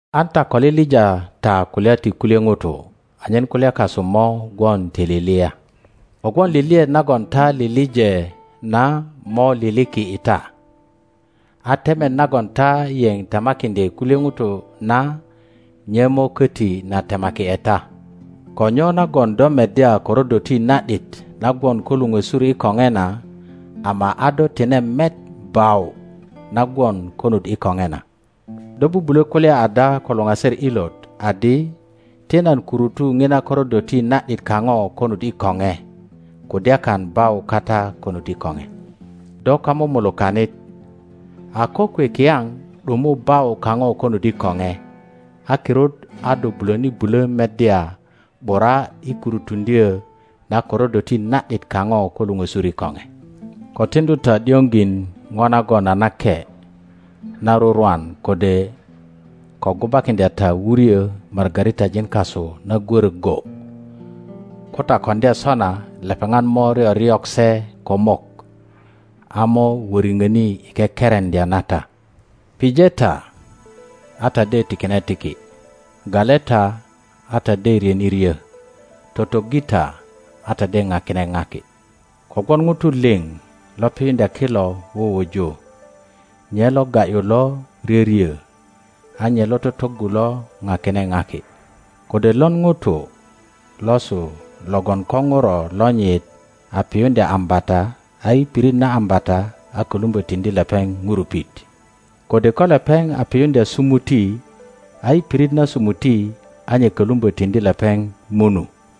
An ta ko liŋ ta kulya ti kulye ŋutu, anyen kulya kasu mo gwon ti lilia. Kogwon liliet nagon ta lileŋ na mo liliki i ta, a temet nagon ta yeŋ temakiŋdye kulye ŋutu na nye mo köti na temaki ’e ta. Ko nyo nagon do meddya korodoti na ’dit na gwon ko luŋösur i koŋe na, ama a do tine met bau na gwon konut i koŋe na? Do bubulö kulya ada ko luŋaser ilot adi, Ti nan kurutu ŋina korodoti na ’dit kaŋo konut i koŋe, kudyakan bau kata konut i koŋe. Do kamumulukanit, a kokwe kiyaŋ ’dumu bau kaŋo konut i koŋe, a kirut a do bulöni bulö meddya ’bura i kurutuŋdyö na korodoti na ’dit kaŋo ko luŋösur i koŋe. Ko tiŋdu ta ’dioŋ jin ŋo nagon a nake na rurwan, kode ko gubakiŋdya ta wuryö margaritajin kasu na gwörö go; ko ta koŋdya sona lepeŋat mo ryoryok se ko mok, a mo wöriŋöni i kekereŋdya na ta. Pije ta, a ta de tikine tiki; gale ta, a ta de ryöni ryo; totoggi ta, a ta deŋakine ŋaki. Kogwon ŋutu liŋ lo piyuŋdya kilo wuwuju, nye lo ga ’yu lo ryöryö, a nye lo totoggu lo ŋakine ŋaki. Kode lon ŋuto losu logon ko ŋuro lonyit a piyuŋdya ambata, a i pirit na ambata a kölumbö tiŋdi lepeŋ ŋurupit? Kode ko lepeŋ a piyuŋdya sumuti, a i pirit na sumuti a nye kolumbö tiŋdi lepeŋ munu?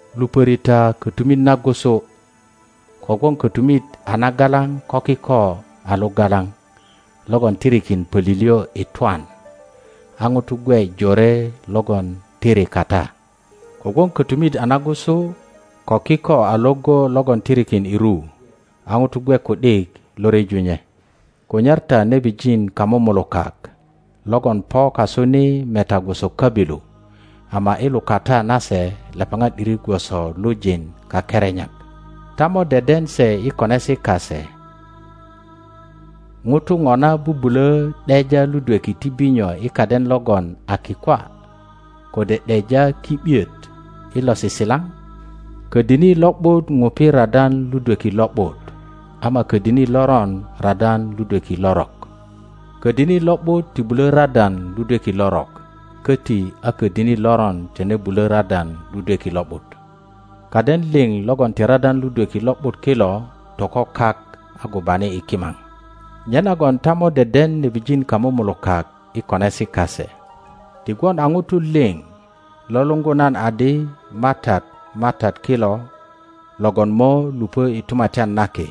Lupöri ta kötumit nagusu, kogwon kötumit a nagalaŋ ko kiko a luŋa laŋ logon tirikin pölilyö i twan, a ŋutu gwe jore logon tirikata. Kogwon kötumit a nagusu ko kiko a Iŋgo logon tirikin i ru, a ŋutu gwe ku ’dik lo ryeju nye. Kunyar ta nebijin kamumulukak logon po kasu ni meta gwoso köbilu, ama i lukata nase lepeŋat ’diri gwoso lujin kakerenyak. Ta mo deden se i konesi kase. ŋutu ŋona bubulö ’deja ludweki ti binyo i kaden logon a kikwa, kode ’deja ki ’biet i losisilaŋ? Ködini lo ’but ŋupi radan ludweki lo ’but, ama ködini loron radan ludweki lorok. Ködini lo ’but ti bulö radan ludweki lorok, köti a ködini loron tine bulö radan ludweki lo ’but. Kaden liŋ logon ti radan ludweki lo ’but kilo toko kak a gubani i kimaŋ. Nyenagon ta mo deden nebijin kamumulukak i konesi kase. Ti gwon a ŋutu liŋ lo luŋgu nan adi, MATAT, MATAT kilo, logon mo lupö i Tumatyan na Ki,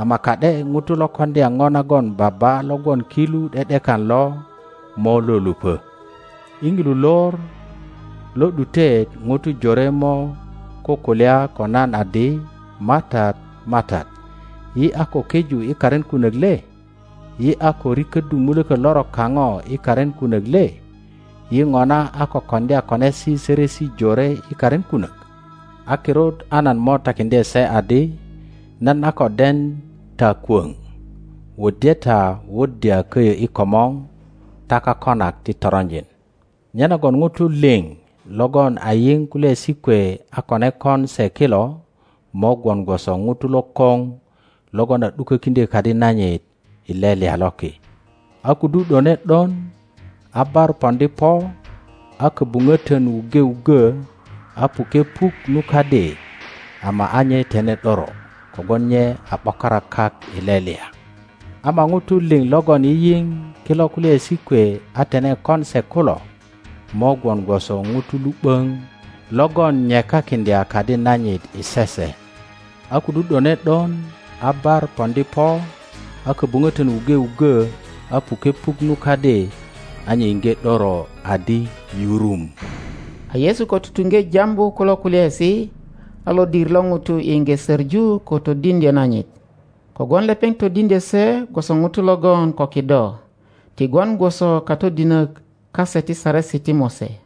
ama ka ’de ŋuto lo koŋdya ŋo nagon Baba lo gwon ki lu ’de ’dekan lo mo lo lupö. I ŋilu lor lo ’dutet ŋutu jore mo kukulya ko nan adi, MATAT, MATAT, yi a ko keju i karin kunök le? Yi a ko riköddu mulökö lorok kaŋo i karin kunök le? Yi ŋona a ko koŋdya konesi sörösi jore i karin kunök? A kirut a nan mo tukökiŋdye se adi, Nan a ko den ta kwöŋ; wuddye ta wuddya köyö i komor ta kakonak ti toronjin. Nyenagon ŋutu liŋ logon a yiŋ kulyaesi kwe a kone kon se kilo, mo gwon gwoso ŋuto lokoŋ logon a ’dukökiŋdyö kadi nanyit i lelya loki. a kudu ’done ’don, a bar poŋdi po, a köbuŋötön wuŋge wuggö, a puke puk nu kadi, ama a nye tine ’doro, kogwon nye a ’bokara kak i lelya. Ama ŋutu liŋ logon yiyiŋ kilo kulyaesi kwe a tine kon se kulo, mo gwon gwoso ŋuto lu ’böŋ logön nyekakiŋdya kadi nanyit i sese. A kudu ’done ’don, a bar poŋdi po, a köbuŋötön wuŋge wuggö, a puke puk nu kadi, a nye iŋge ’döro adi yurum. A Yesu ko tutuŋge jambu kulo kulyaesi, a lodir lo ŋutu iŋge söŋu ko todiŋdyö nanyit, kogwon lepeŋ todiŋdyö se gwosö ŋuto logon ko kido, ti gwon gwoso katodinök kase ti Saresi ti Mose.